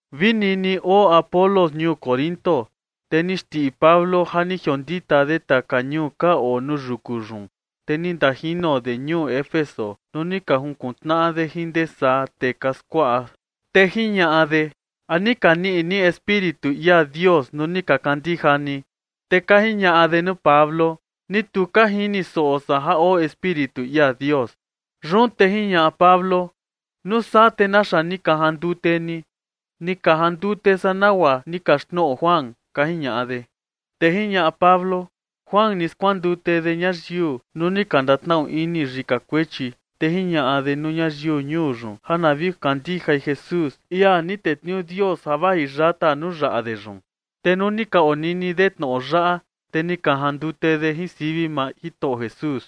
Vi nini oo Apolos ñuu Corinto, te ni xndiꞌi Pablo ja ni jiondita de taka ñuu ka oo nuu yuku yun, te ni ndajino de ñuu Éfeso nuu ni ka junkuntnaꞌa de jin ndee saa tee ka skuaꞌa. Te jiñaꞌa de: ―¿A ni ka niꞌi ni Espíritu ia Dios nuu ni ka kandija ni? Te ka jiñaꞌa de nuu Pablo: ―Ni tu ka jini soꞌo san ja oo Espíritu ia Dios. Yun te jiñaꞌa Pablo: ―¿Nuu saa te naxa ni ka jandute ni? ―Ni ka jandute san nagua ni kaxtnoꞌo Juan ―ka jiñaꞌa de. Te jiñaꞌa Pablo: ―Juan ni skuandute de ñayiu nuu ni ka ndatnaꞌu ini yika kuechi, te jiñaꞌa de nuu ñayiu ñuu yun ja na vi kandijai Jesús, ia ni tetniuu Dios ja vaji yata nuu yaꞌa de yun. Te nuu ni ka onini de tnoꞌo yaꞌa, te ni ka jandute de jin sivi maa Jitoꞌo Jesús.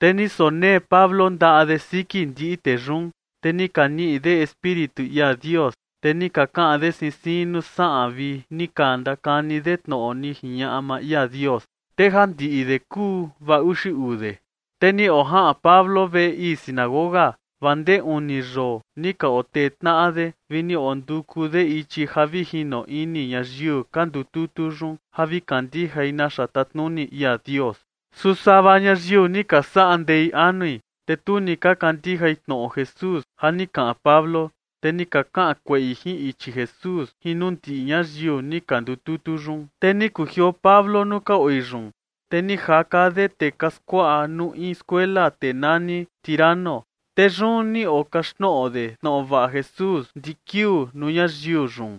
Te ni sonee Pablo ndaꞌa de siki ndiꞌi tee yun, te ni ka niꞌi de Espíritu ia Dios. Te ni ka kaꞌan de siin siin nuu saꞌan vi ni ka ndakani de tnoꞌo ni jiñaꞌa maa ia Dios. Te ja ndiꞌi de kuu vaa uxi uu de. Te ni ojaꞌan Pablo veꞌe ii sinagoga vaa ndee uni yoo ni ka otee tnaꞌa de vi ni onduku de ichi ja vi jino ini ñayiu ka ndututu yun ja vi kandijai naxa tatnuni ia Dios. Su sava ñayiu ni ka saꞌa ndei anui, te tu ni ka kandijai tnoꞌo Jesús ja ni kaꞌan Pablo, te ni ka kaꞌan kueꞌi jin ichi Jesús jin nuu ndiꞌi ñayiu ni ka ndututu yun. Te ni kujioo Pablo nuu ka oi yun, te ni jaka de tee ka skuaꞌa nuu in skuela tee nani Tiranno. Te yun ni okaxtnoꞌo de tnoꞌo vaꞌa Jesús ndiꞌi kiuu nuu ñayiu yun.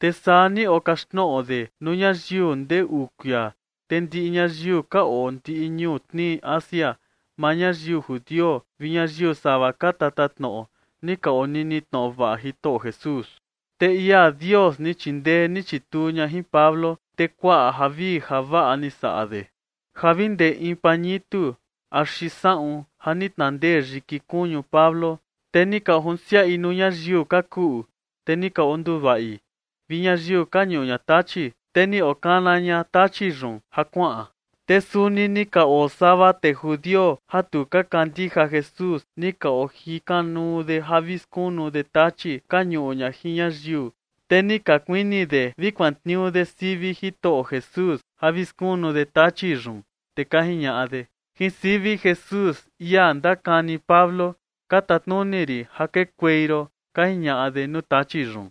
Te saa ni okaxtnoꞌo de nuu ñayiu ndee uu kuia, te ndiꞌi ñayiu ka oo ndiꞌi ñuu tnii Asia, maa ñayiu judio vi ñayiu sava ka tatatnoꞌo, ni ka onini tnoꞌo vaꞌa Jitoꞌo Jesús. Te ia Dios ni chindee ni chituu ña jin Pablo, te kuaꞌa javii javaꞌa ni saꞌa de, ja vi ndee in pañitu axi saꞌun ja ni tnandee yiki kuñu Pablo, te ni ka ojunsiaꞌi nuu ñayiu ka kuꞌu, te ni ka onduvaꞌi, vi ñayiu ka ñuꞌu ña tachi, te ni okana ña tachi yun ja kuaꞌan. Te suni ni ka oo sava tee judio ja tu ka kandija Jesús, ni ka ojikanuu de ja vi skunu de tachi ka ñuꞌu ña jin ñayiu. Te ni ka kuini de vi kuantniuu de sivi Jitoꞌo Jesús ja vi skunu de tachi yun. Te ka jiñaꞌa de: ―Jin sivi Jesús, ia ndakani Pablo, ka tatnuni rin ja kekuei ron ―ka jiñaꞌa de nuu tachi yun.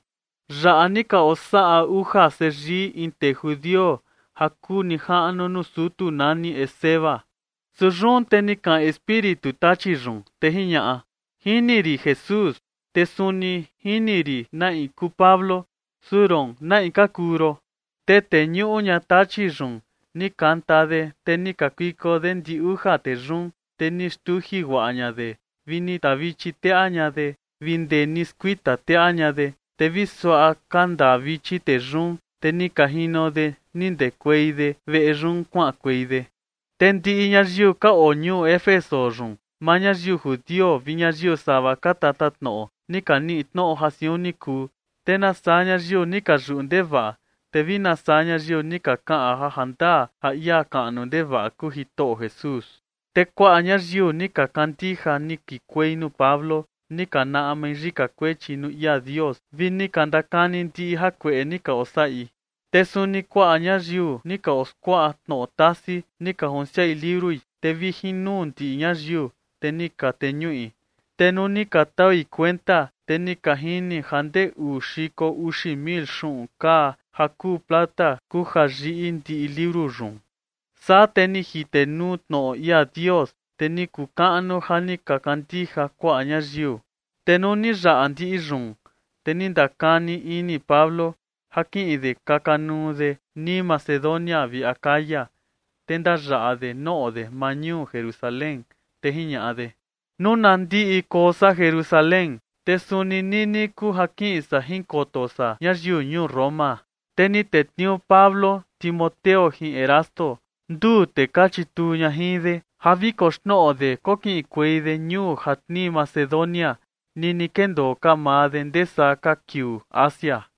Yaꞌa ni ka osaꞌa uja seyii in tee judio ja kuu nijaꞌnu nuu sutu nani Esceva. Su yun te ni kaꞌan espíritu tachi yun, te jiñaꞌa: ―Jini rin Jesús, te suni jini rin na in kuu Pablo, su roon, ¿na in ka kuu ron? Te tee ñuꞌu ña tachi yun ni kanta de, te ni kakuiko de ndi uja tee yun, te ni xtuji guaꞌa ña de vini tavichi teꞌa ña de, vi ndee ni skuita teꞌa ña de. Te vi suaꞌa kanda vichi tee yun, te ni ka jino de ni ndekuei de veꞌe yun kuaꞌankuei de. Te ndiꞌi ñayiu ka oo ñuu Éfeso yun, maa ñayiu judio vi ñayiu sava ka tatatnoꞌo, ni ka niꞌi tnoꞌo ja siun ni kuu. Te nasaa ñayiu ni ka yuꞌu ndevaꞌa, te vi nasaa ñayiu ni ka kaꞌan ja jandaa ja ia kaꞌnu ndevaꞌa kuu Jitoꞌo Jesús. Te kuaꞌa ñayiu ja ni ka kandija ni kikuei nuu Pablo, ni ka naꞌmai yika kuechi nuu ia Dios vi ni ka ndakani ndiꞌi jakueꞌe ni ka osaꞌi. Te suni kuaꞌa ñayiu ni ka oskuaꞌa tnoꞌo tasi, ni ka junsiaꞌi liurui, te vi jin nuu ndiꞌi ñayiu, te ni ka teñuꞌi. Te nuu ni ka taui kuenta, te ni ka jini ja ndee uu xiko uxi mil xuꞌun kaa ja kuu plata kuu ja yiꞌi ndiꞌi liuru yun. Saa te ni jitenuu tnoꞌo ia Dios, te ni kuu kaꞌnu ja ni ka kandija kuaꞌa ñayiu. Tee nuu ni yaꞌa ndiꞌi yun, te ni ndakani ini Pablo ja kiꞌin de kaka nuu de nii Macedonia vi Acaya, te ndayaꞌa de noꞌo de maa ñuu Jerusalén. Te jiñaꞌa de: ―Nuu na ndiꞌi koo san Jerusalén, te suni nini kuu ja kiꞌin san jinkoto san ñayiu ñuu Roma. Te ni tetniuu Pablo Timoteo jin Erasto, nduu tee ka chituu ña jin de, ja vi koxnoꞌo de kokiꞌinkuei de ñuu ja tnii Macedonia nini kendoo ka maa de ndee saa ka kiuu Asia.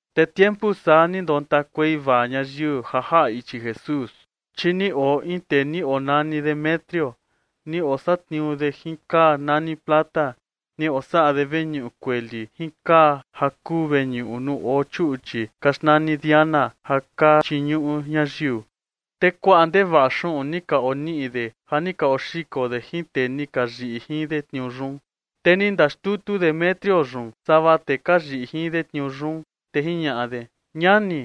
Te tiempu saa ni ndontakuei vaa ñayiu ja jaꞌa ichi Jesús. Chi ni oo in tee ni onani Demetrio, ni osatniuu de jin kaa nani plata. Ni osaꞌa de veñuꞌu kueli jin kaa ja kuu veñuꞌu nuu oo chuꞌchi ka xnani Diana ja ka chiñuꞌu ñayiu. Te kuaꞌa ndevaꞌa xuꞌun ni ka oniꞌi de ja ni ka oxiko de jin tee ni ka yiꞌi jin de tniuu yun. Te ni ndaxtutu Demetrio yun sava ka tee ka yiꞌi jin de tniuu yun, te jiñaꞌa de: ―Ñani,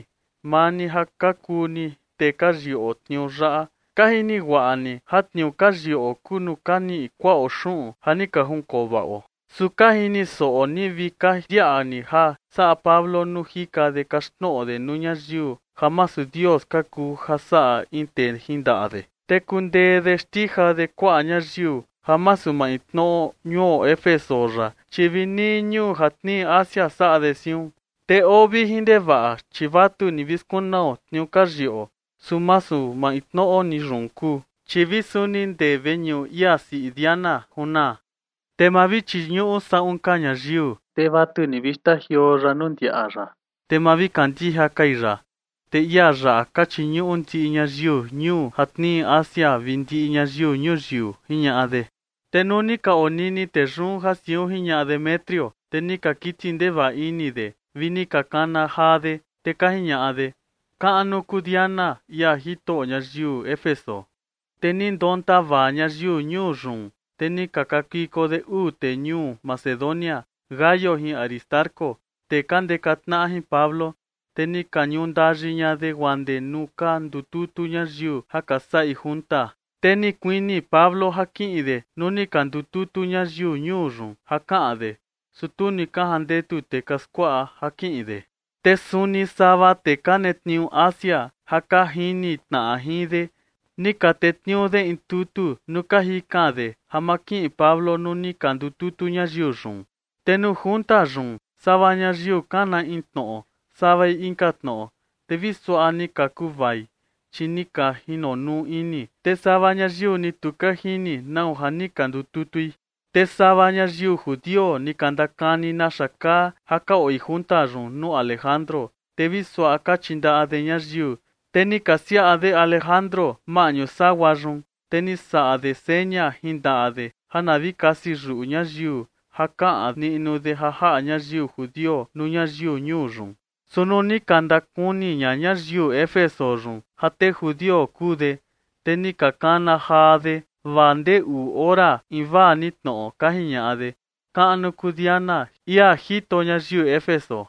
maa ni ja ka kuu ni tee ka yiꞌo tniuu yaꞌa, ka jini guaꞌa ni ja tniuu ka yiꞌo kuu nuu ka niꞌi kuaꞌo xuꞌun ja ni ka jinkovaꞌo. Su ka jini soꞌo ni vi ka ndiaꞌa ni ja saꞌa Pablo nuu jika de kaxtnoꞌo de nuu ñayiu ja masu dios ka kuu ja saꞌa in tee jin ndaꞌa de. Te kundee de xtija de kuaꞌa ñayiu, ja masu maintnoꞌo ñuo Éfeso yaꞌa, chi vi nii ñuu ja tnii Asia saꞌa de siun. Te oo vijin ndevaꞌa, chi vatu ni vi skunao tniuu ka yiꞌo, su masu maintnoꞌo ni yun kuu, chi vi suni ndee veñuꞌu ia siꞌi Diana junaa. Te maa vi chiñuꞌu saꞌun ka ñayiu, te vatu ni vi xtajioo ya nuu ndiaꞌa ya, te ma vi kandija kai ya, te ia yaꞌa ka chiñuꞌu ndiꞌi ñayiu ñuu ja tnii Asia vi ndiꞌi ñayiu ñuyiu ―jiñaꞌa de. Te nuu ni ka onini tee yun ja siun jiñaꞌa Demetrio, te ni ka kiti ndevaꞌa ini de vi ni ka kana jaa de, te ka jiñaꞌa de: ―¡Kaꞌnu kuu Diana, ia jito ñayiu Éfeso! Te ni ndonta vaa ñayiu ñuu yun, te ni ka kakuiko de uu tee ñuu Macedonia, Gayo jin Aristarco, tee ka ndeka tnaꞌa jin Pablo, te ni ka ñundayi ña de guaa ndee nuu ka ndututu ñayiu ja ka saꞌi junta. Te ni kuini Pablo ja kiꞌin de nuu ni ka ndututu ñayiu ñuu yun ja kaꞌan de, su tu ni ka jandetu tee ka skuaꞌa ja kiꞌin de. Te suni sava tee ka netniuu Asia ja ka jini tnaꞌa jin de, ni ka tetniuu de in tutu nuu ka jikan de ja ma kiꞌin Pablo nuu ni ka ndututu ñayiu yun. Te nuu junta yun, sava ñayiu kana in tnoꞌo, savai inka tnoꞌo, te vi suaꞌa ni ka kuvai, chi ni ka jinonuu ini. Te sava ñayiu ni tu ka jini nau ja ni ka ndututui. Te sava ñayiu judio ni ka ndakani naxa kaa ja ka oi junta yun nuu Alejandro. Te vi suaꞌa ka chindaꞌa de ñayiu, te ni ka siaꞌa de Alejandro maꞌñu sagua yun, te ni saꞌa de seña jin ndaꞌa de ja na vi kasi yuꞌu ñayiu ja kaꞌan niꞌnu de ja jaꞌa ñayiu judio nuu ñayiu ñuu yun. Su nuu ni ka ndakuni ña ñayiu Éfeso yun ja tee judio kuu de, te ni ka kana jaa de vaa ndee uu ore invaa ni tnoꞌo, ka jiñaꞌa de: ―¡Kaꞌnu kuu Diana, ia jito ñayiu Éfeso!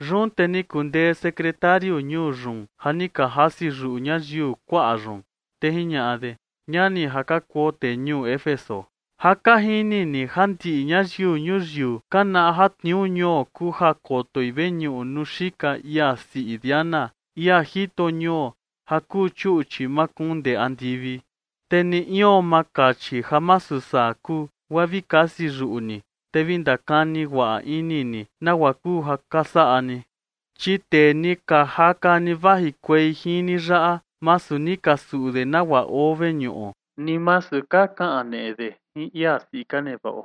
Yun te ni kundee sekretariu ñuu yun ja ni ka jasi yuꞌu ñayiu kuaꞌa yun, te jiñaꞌa de: ―Ñani ja ka kuo tee ñuu Éfeso, ja ka jini ni ja ndiꞌi ñayiu ñuyiu ka naꞌa ja tniuu ñuo kuu ja kotoi veñuꞌu nuu xika ia siꞌi Diana, ia jito ñuo ja kuu chuꞌchi makuun ndee andivi. Te ni ion ma kachi ja masu saa kuu, guaa vi kasi yuꞌu ni, te vi ndakani guaꞌa ini ni nagua kuu ja ka saꞌa ni. Chi tee ni ka jaka ni vajikuei jin ni yaꞌa, masu ni ka suꞌu de nagua oo veñuꞌo, ni masu ka kaneꞌe de jin ia siꞌi ka nevaꞌo.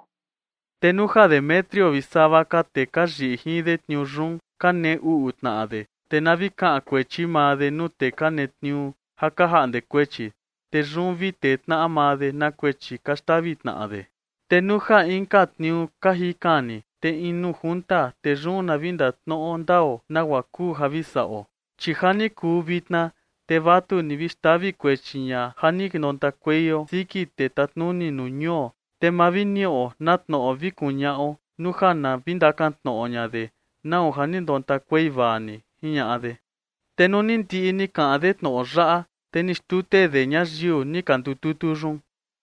Te nuu ja Demetrio vi sava ka tee ka yiꞌi jin de tniuu yun, ka nee uꞌu tnaꞌa de, te na vi kaꞌan kuechi maa de nuu tee ka netniuu ja ka jaꞌnde kuechi. Te yun vi tee tnaꞌa maa de na kuechi ka xtavi tnaꞌa de. Te nuu ja inka tniuu ka jikan ni, te in nuu junta, te yun na vi ndatnoꞌo ndao nagua kuu ja vi saꞌo. Chi ja ni kuu vitna, te vatu ni vi xtavi kuechi ña ja ni ndontakueio siki tee tatnuni nuu ñuo, te ma vi niꞌo na tnoꞌo vi kuñaꞌo nuu ja na vi ndakan tnoꞌo ña de nau ja ni ndontakuei vaa ni ―jiñaꞌa de. Te nuu ni ndiꞌi ni kaꞌan de tnoꞌo yaꞌa, te ni xtute de ñayiu ni ka ndututu yun.